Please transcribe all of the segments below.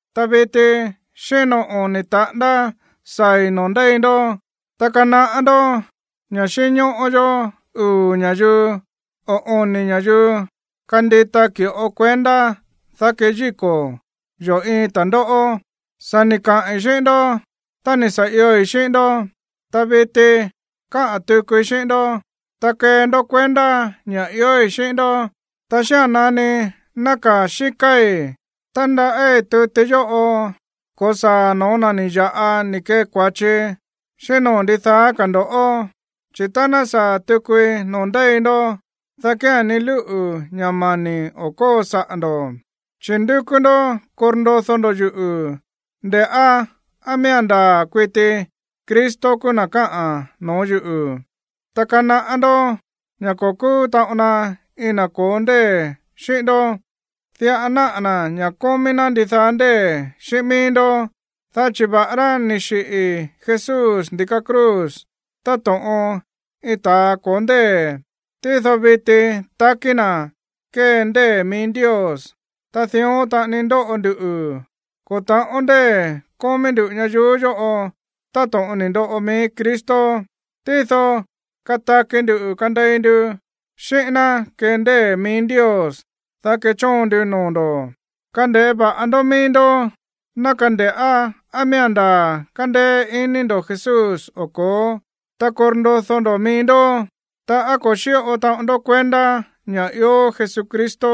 Ta viti xíno oni̱ taꞌándá saa̱i̱ noo̱ ndéi ndó. Ta kanaꞌá ndó ña̱ xínñóꞌó yó uu̱ ña̱yuu o oni̱ ña̱yuu kandita ki̱ꞌo kuendá, dá keyíko̱ yo̱ iin ta̱ndóꞌó. Sa̱ ni̱ kaꞌi̱n xíꞌín ndó tá ni̱ sa̱ ioi̱ xíꞌín ndó, ta viti káꞌa̱n tukui xíꞌín ndó, ta kee ndó kuendá ña̱ iói̱ xíꞌín ndó. Ta xía̱n nani nákaa̱ xíkáí, tándaꞌí tuti yóꞌo ko̱saa̱ no̱ó na̱ ni̱ ya̱ꞌa ni̱ kee kua̱chi, xíꞌín noo̱ ndidaá ka̱ ndo̱ꞌó, chi̱ tá ná saa̱ tukui noo̱ ndéi ndó, dá kía̱n ni lúꞌu̱ ña̱ mani̱ o̱ kóo saꞌa̱ ndo̱. Chi̱ ndúkú ndó korndodó ndó yuꞌu̱ nde̱ꞌá á miía̱n ndaa̱ kuiti Cristo kúú na̱ káꞌa̱n no̱ó yuꞌu̱. Ta kanaꞌá ndó ña̱ ko̱ kúú taꞌon na iin na̱ ko̱ó ndée̱ xíꞌín ndó. Diꞌa náꞌa̱ na̱ ña̱ kómí ná ndidaá ndée̱ xíꞌín mií ndó. Dá chi̱ va̱ꞌará ni̱ xiꞌi̱ Jesús ndi̱ka cruz táto̱ꞌon iin ta̱a ko̱ó ndée̱, tído viti takí na̱ kée ndée̱ mií Ndios. Ta dión taꞌani ndóꞌo nduꞌu̱, ko̱ ta̱ꞌón ndée̱ kómí ndú ñayuú yóꞌo táto̱ꞌon ni̱ ndoꞌo mií Cristo. Tído kataki ndu̱ kandei ndu xíꞌín ná kee ndée̱ mií Ndios, dá kechóon ndu noo̱ ndo̱. Kande̱ꞌé va̱ꞌa ndó mií ndó, ná kande̱ꞌá á miía̱n ndaa̱ kándéé iní ndo̱ Jesús o ko̱ó, ta korndodó ndo̱ mií ndó. Ta, ¿á ko̱ xíꞌo taꞌon ndó kuendá ña̱ ió Jesucristo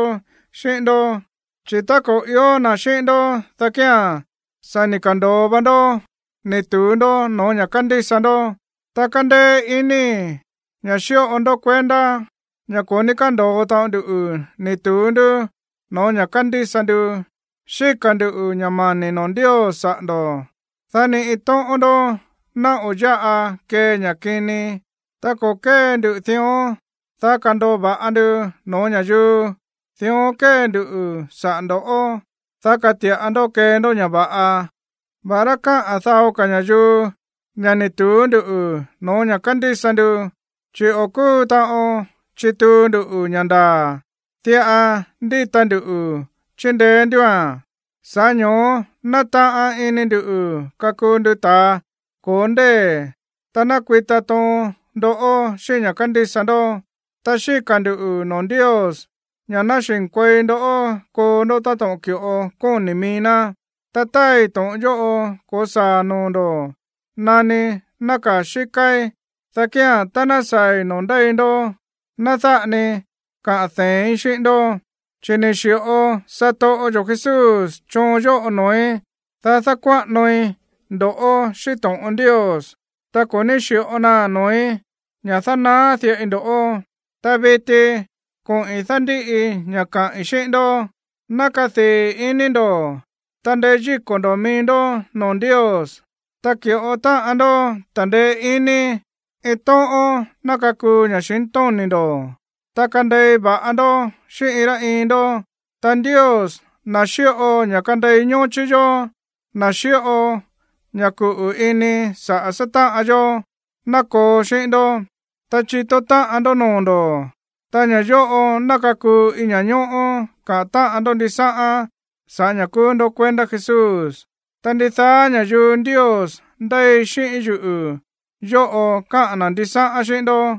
xíꞌín ndó? Chi̱ tá ko̱ i̱ó na̱ xíꞌín ndó, dá kía̱n sa̱ ni̱ ka̱ndo̱o va ndó ni̱ tu̱ú ndó no̱ó ña̱ kándísa ndó. Ta kándéé inii̱ ña̱ xíꞌo ndó kuendá ña̱ ko̱ ní kándo̱o taꞌon ndu ni̱ tu̱ú ndú no̱ó ña̱ kándísa ndu. Xíka̱ ndu̱ ña̱ mani̱ noo̱ Ndios saꞌa̱ ndo̱, dá ni iin tóꞌón ndó ná o̱ yáꞌa kee ña̱ kini. Ta ko̱ kée ndu dión, dá kando̱o va̱ꞌa ndu no̱ó ña̱yuu. Dión kée ndu saꞌa̱ ndo̱ꞌó, dá kati̱ꞌa ndó kee ndó ña̱ va̱ꞌa, va̱ꞌará káꞌa̱n dao ka̱ ña̱yuu ña̱ ni̱ tu̱ú ndú no̱ó ña̱ kándísa ndu. Chi̱ o̱ kúu taꞌon chituu ndu ña̱ ndaa̱, diꞌa ndíta ndu chíndeé ndúa̱n. Sa̱ꞌá ño̱ó nátaꞌan ini ndu̱ kakuu ndu ta̱a ko̱ó ndée̱ tá ná kuita toon ndó xíꞌín ña̱ kándísa ndó. Ta xíka̱ ndu̱ noo̱ Ndios ña̱ ná xi̱nkuei ndó koo ndó táto̱ꞌon ki̱ꞌo kóni̱ mií ná. Ta táai to̱ꞌon yóꞌo ko̱saa̱ noo̱ ndo̱ nani nákaa̱ xíkáí, dá kía̱n, tá ná saa̱i̱ noo̱ ndéi ndó, ná dáꞌa ni kaꞌa̱n dee̱ín xíꞌín ndó, chi̱ ni̱ xi̱ꞌo satoꞌo yo̱ Jesús choon yóꞌo noo̱í, dá dákuáꞌanoi ndo̱ꞌó xíꞌín to̱ꞌon Ndios, ta ko̱ ní xi̱ꞌo naa̱n noo̱í ña̱ dánaá diꞌai ndo̱ꞌó. Ta viti koꞌi̱n dándíꞌi ña̱ káꞌi̱n xíꞌín ndó. Ná kadii̱ iní ndo̱, ta ndeyíko̱ ndo̱ mií ndó noo̱ Ndios, ta ki̱ꞌo táꞌan ndó ta̱ndeé iní, iin tóꞌón ná kakuu ña̱xintóni̱ ndo̱, ta kandei va̱ꞌa ndó xíꞌín iin rá iin ndó. Ta Ndios, na̱ xíꞌo ña̱ kandei ñóchí yó, na̱ xíꞌo ña̱ kuꞌu̱ ini saꞌa̱ sátáꞌan yó, ná koo xíꞌín ndó. Ta chitó táꞌan ndó noo̱ ndo̱, ta ña̱ yóꞌo ná kakuu iin ña̱ñóꞌó kaꞌa̱n táꞌan ndó ndisáꞌán sa̱ꞌá ña̱ kúú ndó kuendá Jesús. Ta ndidaá ña̱yuu Ndios ndéi xíꞌín yuꞌu̱ yóꞌo káꞌa̱n na̱ ndisáꞌán xíꞌín ndó.